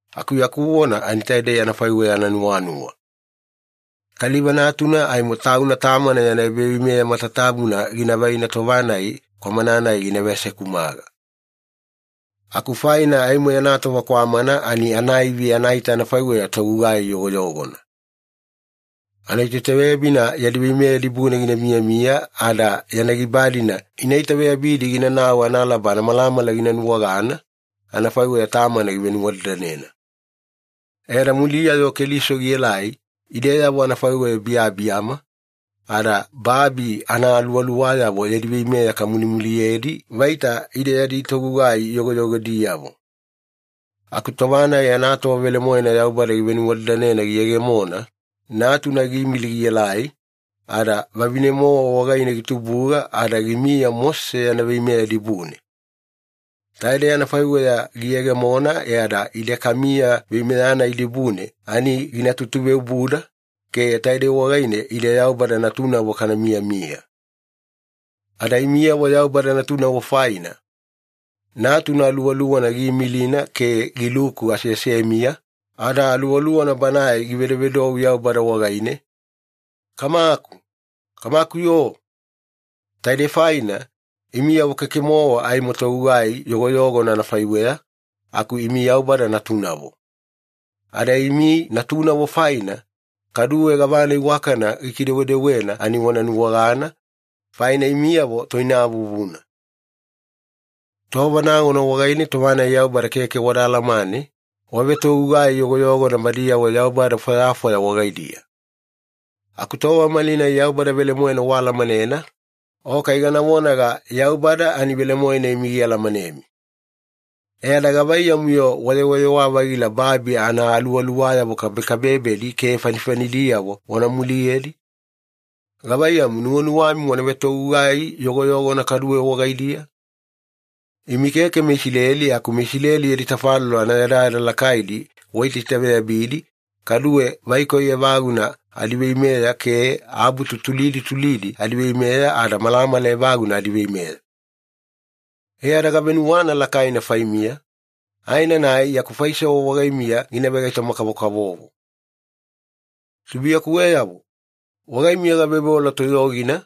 Aku yaku vona ani taidei anafaiweya ananuwanuwa. Kaliva natuna aimo tauna tamana yana ebaveimeya matatabuna gina vaina tova-nai kwamana-nai gina veasekumaga. Aku faina aimo yana tova kwamana ani anaivi anaita anafaiweya togugai yogoyogona. Anatoitaveyabina yadi veimeya dibune gina miyamiya ada yana giba-dina ina itaveyabidi ginanau analaba anamalamala gina nuwagana, anafaiweya tamana givenuwadadanena. E ada muliya-yo Keliso gielai, ideyavo anafaiweya biyabiyama, ada babi anaaluwaluwayavo yadi veimeya kamulimuliyedi vaita ide yadi togugai yogoyogodiyavo. Aku tova-nai anatova velemoena Yaubada givenuwadadanena giyegemona, Natuna giimili gielai, ada vavine-mowa wagaine gitubuga ada gimiya Mosese yana veimeya dibune. Taidei anafaiweya giyegemona e ada ide kamiya veimeya-nai dibune ani gina tutuveobuda, ke taidei wagaine ide Yaubada natunavo kana miyamiya. Ada imiyavo Yaubada natunavo faina, Natuna Aluwaluwana giimilina ke giluku aseasemiya, ada Aluwaluwana Banae givedovedou Yaubada wagaine, “Kamaku! Kamaku-yo!” Taidei faina, imiyavo keke-mowa aimo togugai yogoyogona anafaiweya, aku imi Yaubada natunavo. Ada imi natunavo faina, kaduwe gavana iwakana gikidewedewena ani wana nuwagana, faina imiyavo toinavuvuna. Tova nagona wagaine tova-nai Yaubada keke wada alamane, wavetogugai yogoyogona badiyavo yaubada fwayafwaya wagaidiya. Aku tova malinai Yaubada velemoena waalamanena, o kai gana vonaga Yaubada ani velemoena imi gialamanemi. E ada gavaiyamu-yo wayewayewa-vagila babi anaaluwaluwayavo kabekabebedi ke fanifanidiyavo wana muliyedi? Gavaiyamu, nuwanuwami wana vetogugai yogoyogona kaduwe wagaidiya? Imi keke meIsileli aku meIsileli yadi tafalolo anayadayada lakaidi waitaitaveyabidi, kaduwe vaikoi evaguna adiveimeya ke abutu tulidi tulidi adiveimeya ada malamala evaguna adiveimeya. E ada gavenuwana lakaina faimiya, aenanai yaku faisewa wagaimiya gina vegaitoma-kavokavovo. Tubuiyakuweyavo, wagaimiya gaveoveola toyogina,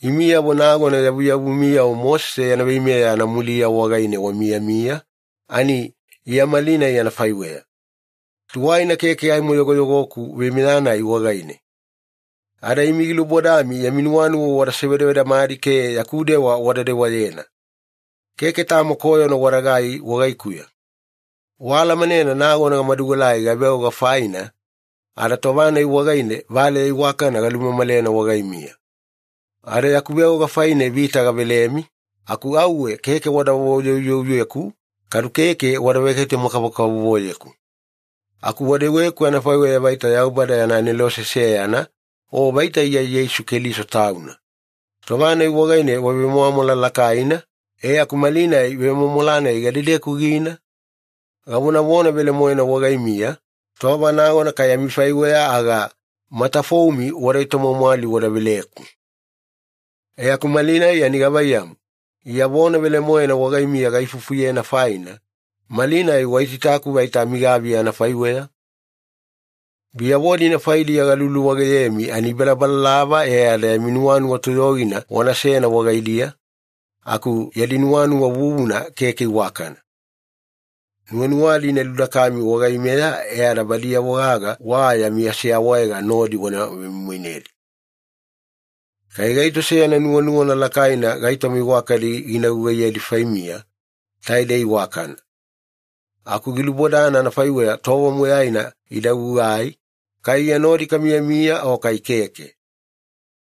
imiyavo nagona yavuyavumiyavo Mosese yana veimeya anamuliya wagaine wamiyamiya, ani Iya malinai anafaiweya. Tuwaina keke aimo yogoyogoku veimeya-nai wagaine. Ada imi gilubodami yami nuwanuwa wada sevedavedamadi ke yaku dewa wada dewayena. Keke tamo koyona wadagai wagaikuya. Waalamanena nagona gamaduelai gaveoga faina, ada tova-nai wagaine valeya iwakana galumamalena wagaimiya. Ada yaku veoga faina vita gavelemi, aku auwe keke wada voyouyouyeku kadu keke wada vegaitoma-kavokavovoyeku. Aku wadeweku anafaiweya vaita Yaubada yana anelose seyana, o vaita Iya Yeisu Keliso Tauna. Tova-nai wagaine wavemwamwala lakaina, e aku malinai vemwamwala-nai gadedeku gina? Gavonavona velemoena wagaimiya, tova nagona kai amifaiweya aga, matafoumi wada etomwamwali wada veleku. E aku malinai ani gavaiyamu, Iya vona velemoena wagaimiya gaifufuyena faina, malinai waitaitaku vaita amigaviya anafaiweya? Biyavo-dina faidiya galuluwageyemi ani ibalabalalava e ada yami nuwanuwa toyogina wanasena wagaidiya, aku yadi nuwanuwa vuvuna keke iwakana. Nuwanuwadi ina ludakami wagaimeya e ada badiyavo gaga wa yami aseawaega nodi wana vemoimoinedi. Kai gaito seyana nuwanuwana lakaina gaitoma iwakadi gina gugaiyedi faimiya, taidei iwakana. Aku gilubodana anafaiweya tova moyaina ida gugai, kai Iya nodi kamiyamiya o kai keke.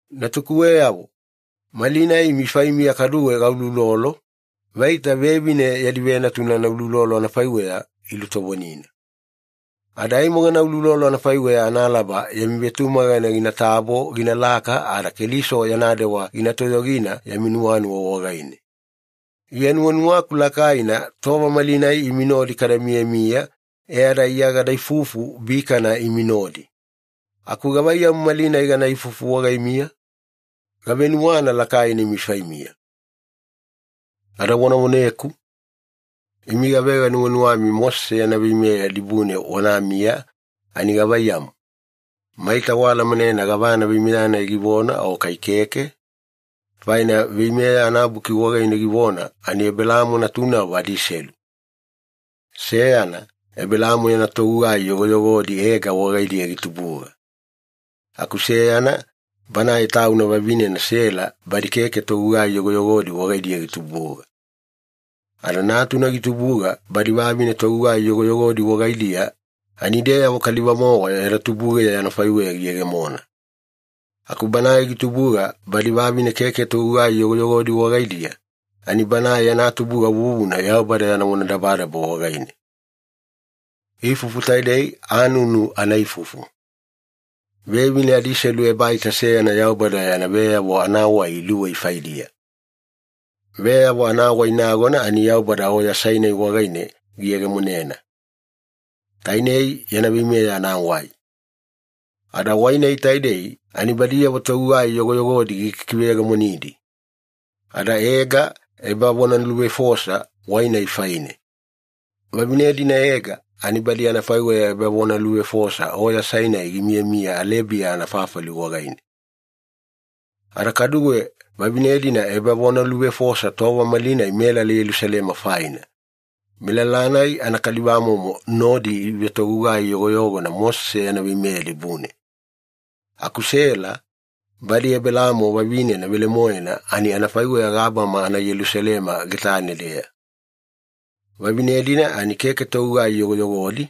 Natukuweyavo, malinai imi faimiya kaduwe gauloulolo, vaita vevine yadi venatuna anauloulolo anafaiweya ilutovonina. Ada aimo gana uloulolo anafaiweya analaba yami vetumagana ginatabo ginalaka ada Keliso yana dewa gina toyogina yami nuwanuwa wagaine. Iya nuwanuwaku lakaina tova malinai imi nodi kada miyamiya e ada Iya gada ifufu bikana imi nodi. Aku gavaiyamu malinai gana ifufu wagaimiya? Gavenuwana lakaina imi faimiya. Ada wana voneku. Imi gavega nuwanuwami Mosese yana veimeya dibune wanamiya ani gavaiyamu, maita waalamanena gavana veimeya-nai givona o kai keke? Faina Veimeya anabuki wagaine givona ani Ebelaamo natunavo adiselu. Seyana, Ebelaamo yana togugai yogoyogodi Ega wagaidiya gitubuga. Aku seyana, banae tauna vavinena Sela badi keke togugai yogoyogodi wagaidiya gitubuga. Ada natuna gitubuga badi vavine togugai yogoyogodi wagaidiya ani ideyavo kaliva-mowa yada tubugeya anafaiweya giyegemona. Aku banae gitubuga badi vavine keke togugai yogoyogodi wagaidiya, ani banae yana tubuga vuvuna Yaubada yana vonadabadaba wagaine. Ifufu taidei anunu anaifufu. Vevine adiselu ebaita seyana Yaubada yana veyavo anawai iluwei faidiya. Veyavo anawai nagona ani Yaubada Oya Sainai wagaine giyegemonena, tainei yana veimeya anawai. Ada wai-nai taidei ani badiyavo togugai yogoyogodi gikikiveyegemonidi. Ada Ega ebavonaluvefosa wai-nai faine. Vavine-dina Ega ani badi anafaiweya ebavonaluvefosa Oya Sainai gimiyamiya Alebiya anafafali wagaine. Ada kaduwe vavine-dina ebavonaluvefosa tova malinai melala Yelusalema faina. Melala-nai anakalivamomo nodi ivetogugai yogoyogona Mosese yana veimeya dibune. Aku Sela, badi Ebelaamo vavinena velemoena ani anafaiweya gabama anaYelusalema getane-deya. Vavine-dina ani keke togugai yogoyogodi,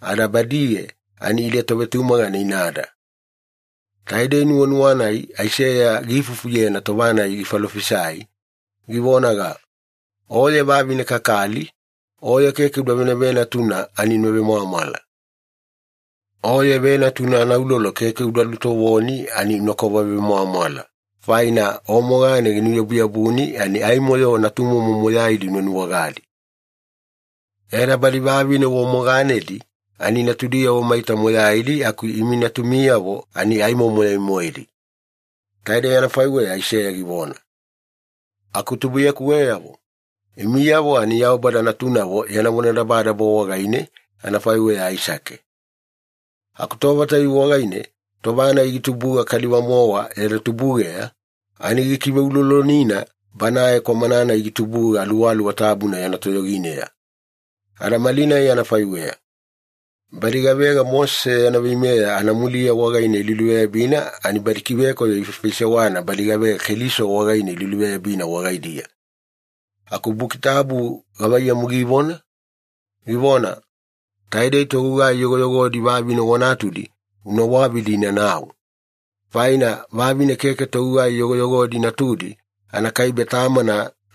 ada badiye ani ide tovetumagana inada. Taidei nuwanuwa-nai Aiseya giifufuyena tova-nai gifalofisai, givonaga, “Oye vavine kakali, oye keke uda venavenatuna ani una vemwamwala. Oye venatuna anaulolo keke uda lutovoni ani unakova vemwamwala, faina o mogane ginuyabuyabuni ani aimo-yo natumomo moyaidi una nuwagadi. E ada badi vavine wa moganedi ani natudiyavo maita moyaidi aku imi natumiyavo ani aimo moyai-moedi.” Taidei anafaiweya Aiseya givona. Aku tubuiyakuweyavo, imiyavo ani Yaubada natunavo yana vonadabadaba wagaine, anafaiweya Aisake. Aku tova tayuwe wagaine natuna-nai gitubuga kaliva-mowa yada tubugeya, ani gikiveulolonina banae kwamana-nai gitubuga Aluwaluwa Tabuna yana toyogineya. Ada malinai anafaiweya. Badi gavega Mosese yana veimeya anamuliya wagaine iluluveyabina ani badi kivekoyo ifaifaisewana badi gavega Keliso wagaine iluluveyabina wagaidiya. Aku Buki Tabu gavaiyamu givona? Givona, “Taidei togugai yogoyogodi vavine wa natudi una wavidi inanau. Faina vavine keke togugai yogoyogodi natudi anakaibe tamana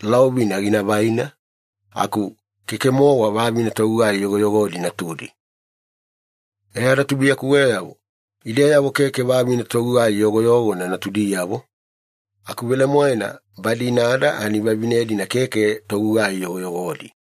laovina gina vaina, aku keke-mowa vavine togugai yogoyogodi natudi.” E ada tubuiyakuweyavo, ideyavo keke vavine togugai yogoyogona natudiyavo, aku velemoena badi inada ani vavine-dina keke togugai yogoyogodi.